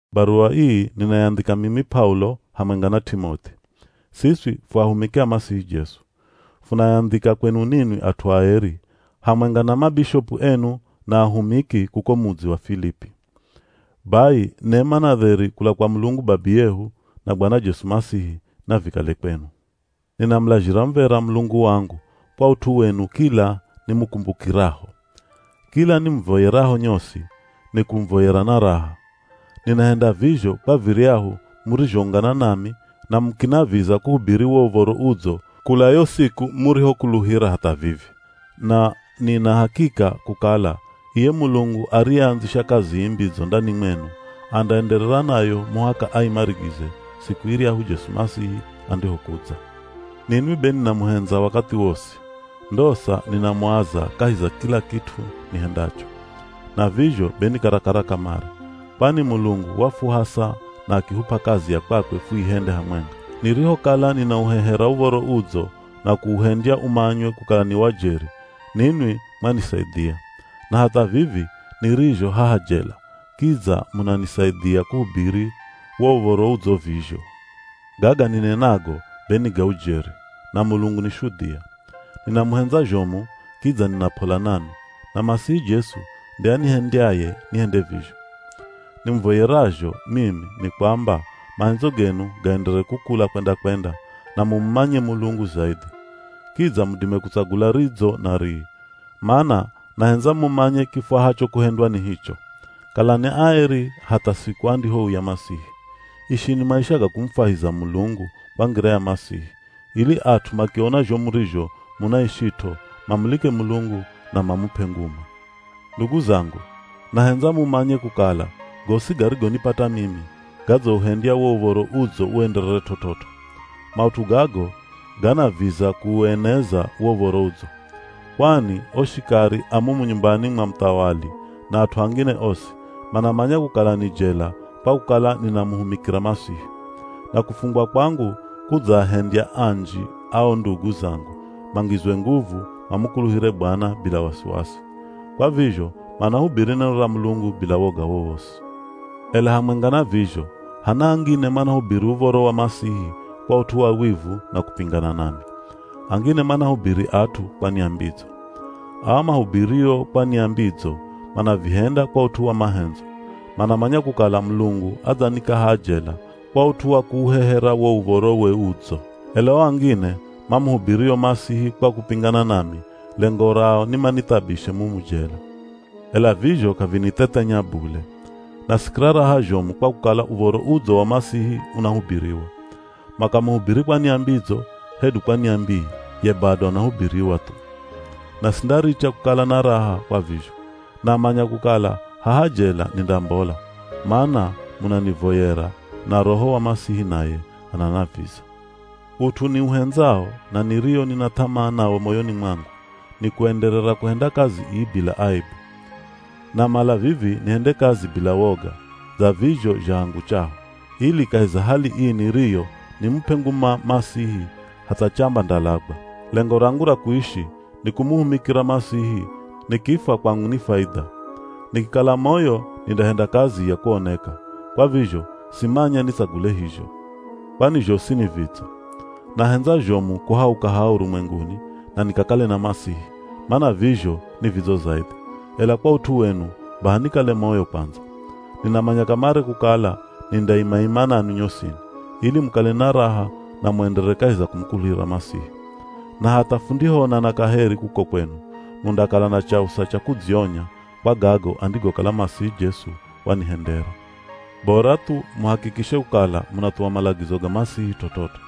Baruwa ii ninayandhika mimi P'aulo, hamwenga na T'imoth'i. Siswi fu ahumiki a Masihi Jesu. Funayandhika kwenu ninwi at'u aeri, hamwenga na mabishopu enu na ahumiki kuko mudzi wa Filipi. Bai nema na dheri kula kwa Mulungu Babiyehu na Bwana Jesu Masihi, navikale kwenu. Ninamulazhira muv̱era Mulungu wangu kwa ut'u wenu kila nimukumbukiraho. Kila nimuvoyeraho nyosi, nikumuvoyera na raha. Ninahenda vizho kwa viryahu murizhoungana nami na mukinaviza kuhubiri wo Uv̱oro Udzo kula yo siku murihokuluhira hatha vivi. Na nina hakika kukala iye Mulungu ariyeandzisha kazi ii mbidzo ndani mwenu, andaenderera nayo muhaka aimarigize siku iryahu Jesu Masihi andihokudza. Ninwi be ninamuhendza wakathi wosi, ndosa ninamuaza kahi za kila kit'u nihendacho. Na vizho be ni karakara kamare, kwani Mulungu wafuhasa na akihup'a kazi ya kwakwe fuihende hamwenga. Nirihokala ninauhehera Uv̱oro Udzo na kuuhendya umanywe kukala ni wa jeri, ninwi mwanisaidhia. Na hatha vivi nirizho haha jela kidza munanisaidhia kuhubiri wo Uv̱oro Udzo vizho. Gaga ninenago be ni ga ujeri, na Mulungu ni shudhia. Ninamuhendza zhomu kidza nina p'ola nanwi, na Masihi Jesu nde anihendyaye nihende vizho. Nimuvoyerazho mimi, ni kwamba mahendzo genu gaenderere kukula kwenda-kwenda, na mumumanye Mulungu zaidhi. Kidza mudime kutsagula ridzo na rii, mana nahendza mumanye kifwahacho kuhendwa ni hicho. Kalani aeri hatha siku andihouya Masihi. Ishini maisha ga kumufwahiza Mulungu kwa ngira ya Masihi, ili at'u makiona zho murizho munaishit'o, mamulike Mulungu na mamup'e nguma. Ndugu zangu, nahendza mumanye kukala gosi garigonipata mimi, gadzauhendya wo Uv̱oro Udzo uenderere t'ot'ot'o. Maut'u gago ganaviza kuueneza wo Uv̱oro Udzo. Kwani o shikari a mumu nyumbani mwa muthawali na at'u angine osi, manamanya kukala ni jela kwa kukala ninamuhumikira Masihi. Na kufungwa kwangu kudzaahendya anji a o ndugu zangu, mangizwe nguvu mamukuluhire Bwana bila wasiwasi. Kwa vizho, manahubiri neno ra Mulungu bila woga wowosi. Ela hamwenga na vizho, hana angine manahubiri Uv̱oro wa Masihi kwa ut'u wa wivu na kupingana nami. Angine manahubiri at'u kwa nia mbidzo. Aa mahubirio kwa nia mbidzo manavihenda kwa ut'u wa mahendzo. Manamanya kukala Mulungu adzanika haha jela kwa ut'u wa kuuhehera wo Uv̱orowe Udzo. Ela o angine, mamuhubirio Masihi kwa kupingana nami, lengo rao ni manithabishe mumu jela. Ela vizho k'avinithethenya bule. Nasikira raha zhomu, kwa kukala Uv̱oro Udzo wa Masihi unahubiriwa. Makamuhubiri kwa nia mbidzo, hedu kwa nia mbii, ye bado anahubiriwa thu. Na sindaricha kukala na raha kwa vizho. Namanya kukala haha jela nindambola, mana munanivoyera na Roho wa Masihi naye ananaviza. Ut'u niuhendzao, na nirio nina th'amaa nawo moyoni mwangu, nikuenderera kuhenda kazi ii bila aebu. Namala vivi nihende kazi bila woga, dza vizho zha hangu chaho, ili kahi za hali ii niriyo nimup'e nguma Masihi hatha chamba ndalagwa. Lengo rangu ra kuishi nikumuhumikira Masihi, nikifwa kwangu ni faidha. Nikikala moyo nindahenda kazi ya kuoneka. Kwa vizho simanya nitsagule hizho, kwani zhosi ni vidzo. Nahendza zhomu kuhauka haha urumwenguni na nikakale na Masihi, mana vizho ni vidzo zaidhi, ela kwa ut'u wenu baha nikale moyo kwandza. Ninamanya kamare kukala nindaima-ima nanwi nyosini, ili mukale na raha na muenderere kahi za kumukuluhira Masihi. Na hatha fundihoonana kaheri kuko kwenu, mundakala na chausa cha kudzionya kwa gago andigokala Masihi Jesu wanihendera. Bora thu muhakikishe kukala munathuwa malagizo ga Masihi t'ot'ot'o.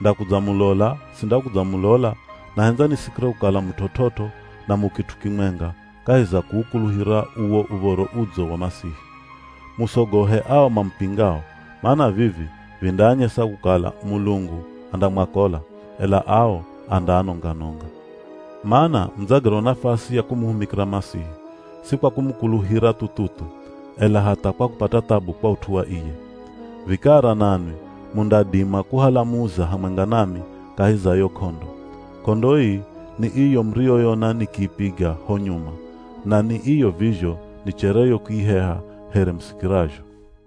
Ndakudzamulola, sindakudzamulola, nahendza nisikire kukala mu t'ot'ot'o, na mu kit'u kimwenga kahi za kuukuluhira uwo Uv̱oro Udzo wa Masihi. Musogohe ao mamupingao, mana vivi vindaanyesa kukala Mulungu andamwakola, ela ao andaanonga-nonga. Mana mudzagerwa nafasi ya kumuhumikira Masihi, si kwa kumukuluhira thu-thu-thu, ela hatha kwa kupata thabu kwa ut'u wa iye. Vikara nanwi mundadima kuhala muza hamwenga nami kahi za yo k'ondo. K'ondo ii, ni iyo muriyonona nikiipiga ho nyuma, na ni iyo vizho nichereyo kuiheha here musikirazho.